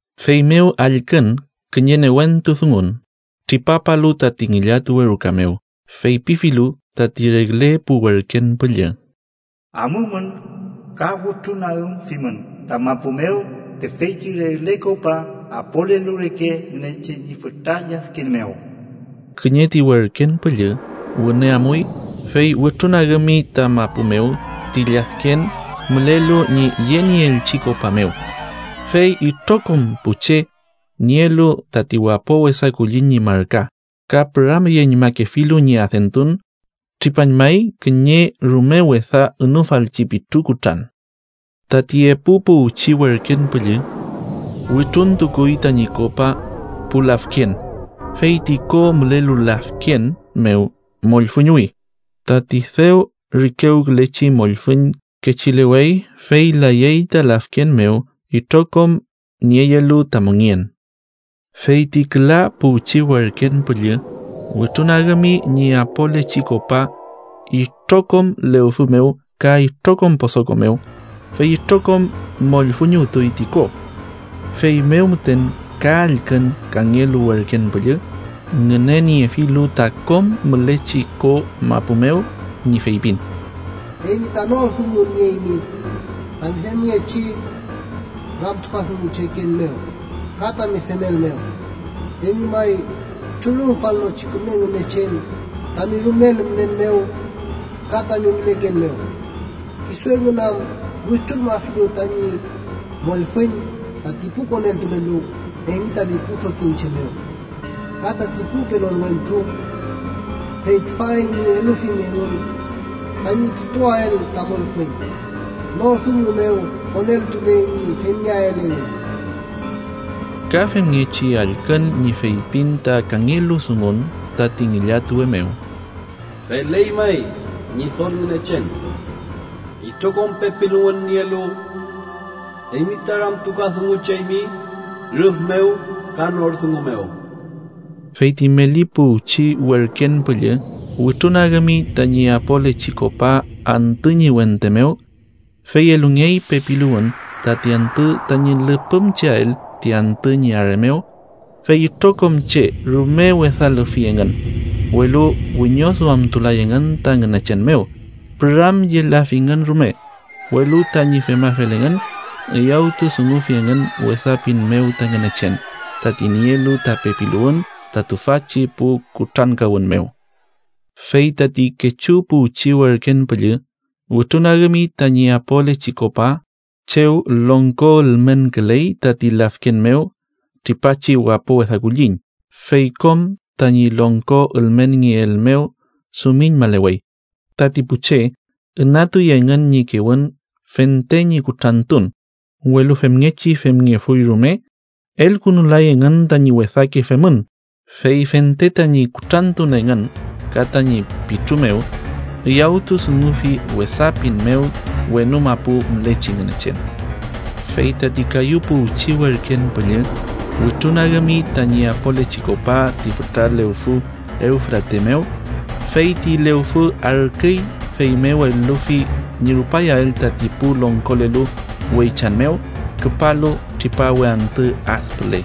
Feymew allkün kiñe newentu dungun, tripapalu tati ngillatuwe ruka mew, feypifilu tati regle pu werken püllü: “Amumün ka wütrunagümfimün ta mapu mew tüfeychi regle kopa apolelu reke Ngünechen ñi fütra lladken mew.” Kiñe ti werken püllü wüne amuy, fey wütrunagümi ta mapu mew ti lladken mülelu ñi yenieelchi kopa mew, fey itrokom pu che nielu tati wapo wesa kulliñ ñi marka ka püramyeñmakefilu ñi adentun, tripañmay kiñe rume wesa ünufalchi pitru kutran. Tati epu puwchi werken püllü wütruntukuy tañi kopa pu lafken, fey ti ko mülelu lafken mew mollfüñuwi, tati dew rikewkülechi mollfüñ kechilewey, fey layey ta lafken mew itrokom nieyelu ta mongen. Fey ti küla puwchi werken püllü wütrunagümi ñi apolechi kopa itrokom lewfü mew ka itrokom posoko mew, fey itrokom mollfüñuwtuy ti ko. Feymew müten ka allkün kangelu werken püllü, ngüneniefilu ta kom mülechi ko mapu mew, ñi feypin: “Eymi ta nor dungun nieymi tami femngechi ramtukadungucheken mew ka tami femel mew. Eymi may Trürümfalnochi Küme Ngünechen, tami rumel mülen mew ka tami müleken mew, Kisu engün am wütrulmafilu tañi mollfüñ tati pu koneltulelu eymi tami pu trokiñche mew, ka tati pu pelon wentru, fey tüfa eymi elufimi engün tañi putuael ta mollfüñ. ¡Nor dungu mew koneltuley ñi femngeael engün!” Ka femngechi allkün ñi feypin ta kangelu dungun tati ngillatuwe mew: “Feley may, Ñidol Ngünechen, itrokom pepiluwün nielu, eymi ta ramtukadungucheymi rüf mew ka nor dungu mew.” Fey ti meli puwchi werken püllü wütrunagümi tañi apolechi kopa antü ñi wente mew, fey elungey pepiluwün tati antü tañi lüpümcheael ti antü ñi are mew. Fey itrokom che rume wesa lüfi engün, welu wiñoduamtulay engün ta Ngünechen mew, püramyelafingün rume. Welu tañi femafel engün, üyawtudungufi engün wesa pin mew ta Ngünechen, tati nielu ta pepiluwün ta tüfachi pu kutrankawün mew. Fey tati kechu puwchi werken püllü wütrunagümi tañi apolechi kopa chew longko ülmenküley tati lafken mew tripachi wapo wesa kulliñ, fey kom tañi longko ülmenngeel mew dumiñmalewey. Tati pu che ünatuy engün ñi kewün fente ñi kutrantun. Welu femngechi femngefuy rume, elkünulay engün tañi wesake femün, fey fente tañi kutrantun engün ka tañi pitru mew, üyawtudungufi wesa pin mew wenu mapu mülechi Ngünechen. Fey tati kayu puwchi werken püllü wütrunagümi tañi apolechi kopa ti fütra lewfü Ewfrate mew, fey ti lewfü arküy, feymew elufi ñi rupayael tati pu longkolelu weychan mew küpalu tripawe antü ad püle.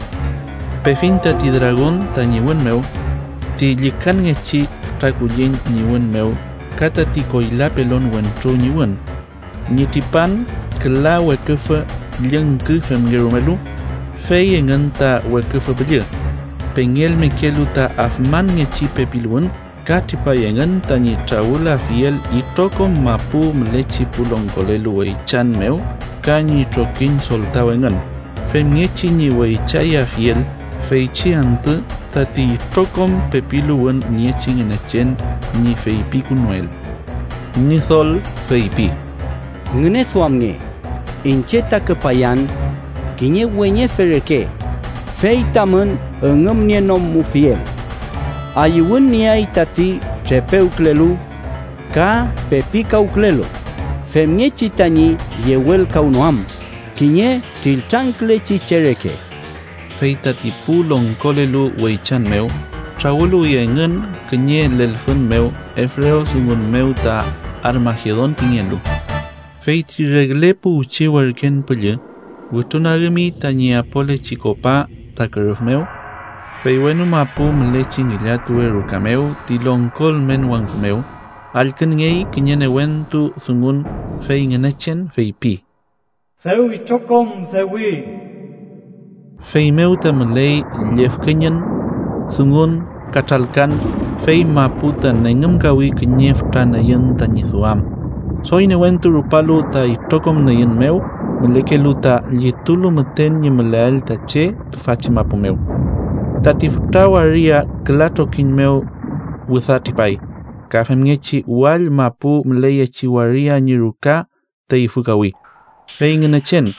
Pefiñ tati dragon tañi wün mew, ti llükanngechi fütra kulliñ ñi wün mew ka tati koyla pelon wentru ñi wün, ñi tripan küla weküfü llüngki femngerumelu. Fey engün ta weküfü püllü, pengelmekelu ta afmanngechi pepiluwün ka tripay engün tañi trawülafiel itrokom mapu mülechi pu longkolelu weychan mew ka ñi trokiñ soltaw engün, femngechi ñi weychayafiel feychi antü tati itrokom pepiluwün niechi Ngünechen ñi feypikünuel. Ñidol feypi: “Ngüneduamnge, iñche ta küpayan kiñe weñefe reke, fey tamün üngümnienomufiel. Ayüwün nieay tati trepewkülelu ka pepikawkülelu, femngechi tañi yewelkawnoam kiñe triltrangkülechi che reke.” Fey tati pu longkolelu weychan mew trawüluwi engün kiñe lelfün mew ebrewdungun mew ta Armagedon pingelu. Fey ti regle puwchi werken püllü wütrunagümi tañi apolechi kopa ta kürüf mew, fey wenu mapu mülechi ngillatuwe ruka mew ti longko ülmen wangku mew allkünngey kiñe newentu dungun, fey Ngünechen feypi: “¡Dew itrokom dewi!” Feymew ta müley llüfkeñün, dungun ka tralkan, fey mapu ta nengümkawi kiñe fütra nüyün tañi duam, doy newentu rupalu ta itrokom nüyün mew mülekelu ta llitulu müten ñi müleael ta che tüfachi mapu mew. Tati fütra waria küla trokiñ mew wüda tripay, ka femngechi wall mapu müleyechi waria ñi ruka teyfükawi. Fey Ngünechen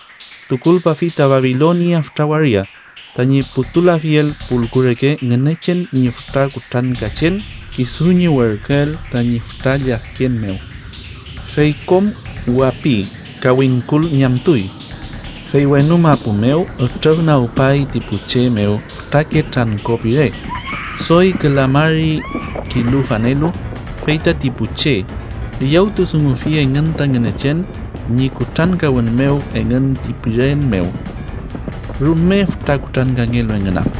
tukulpafi tati Babilonia fütra waria, tañi putulafiel pulku reke Ngünechen ñi fütra kutrankachen kisu ñi werküel tañi fütra lladken mew. Fey kom wapi ka wingkul ñamtuy. Fey wenu mapu mew ütrüfnagpay ti pu che mew fütrake trangko pire, doy küla mari kilu fanelu, fey tati pu che üyawtudungufi engün ta Ngünechen ñi kutrankawün mew engün ti piren mew, rume fütra kutrankangelu engün am.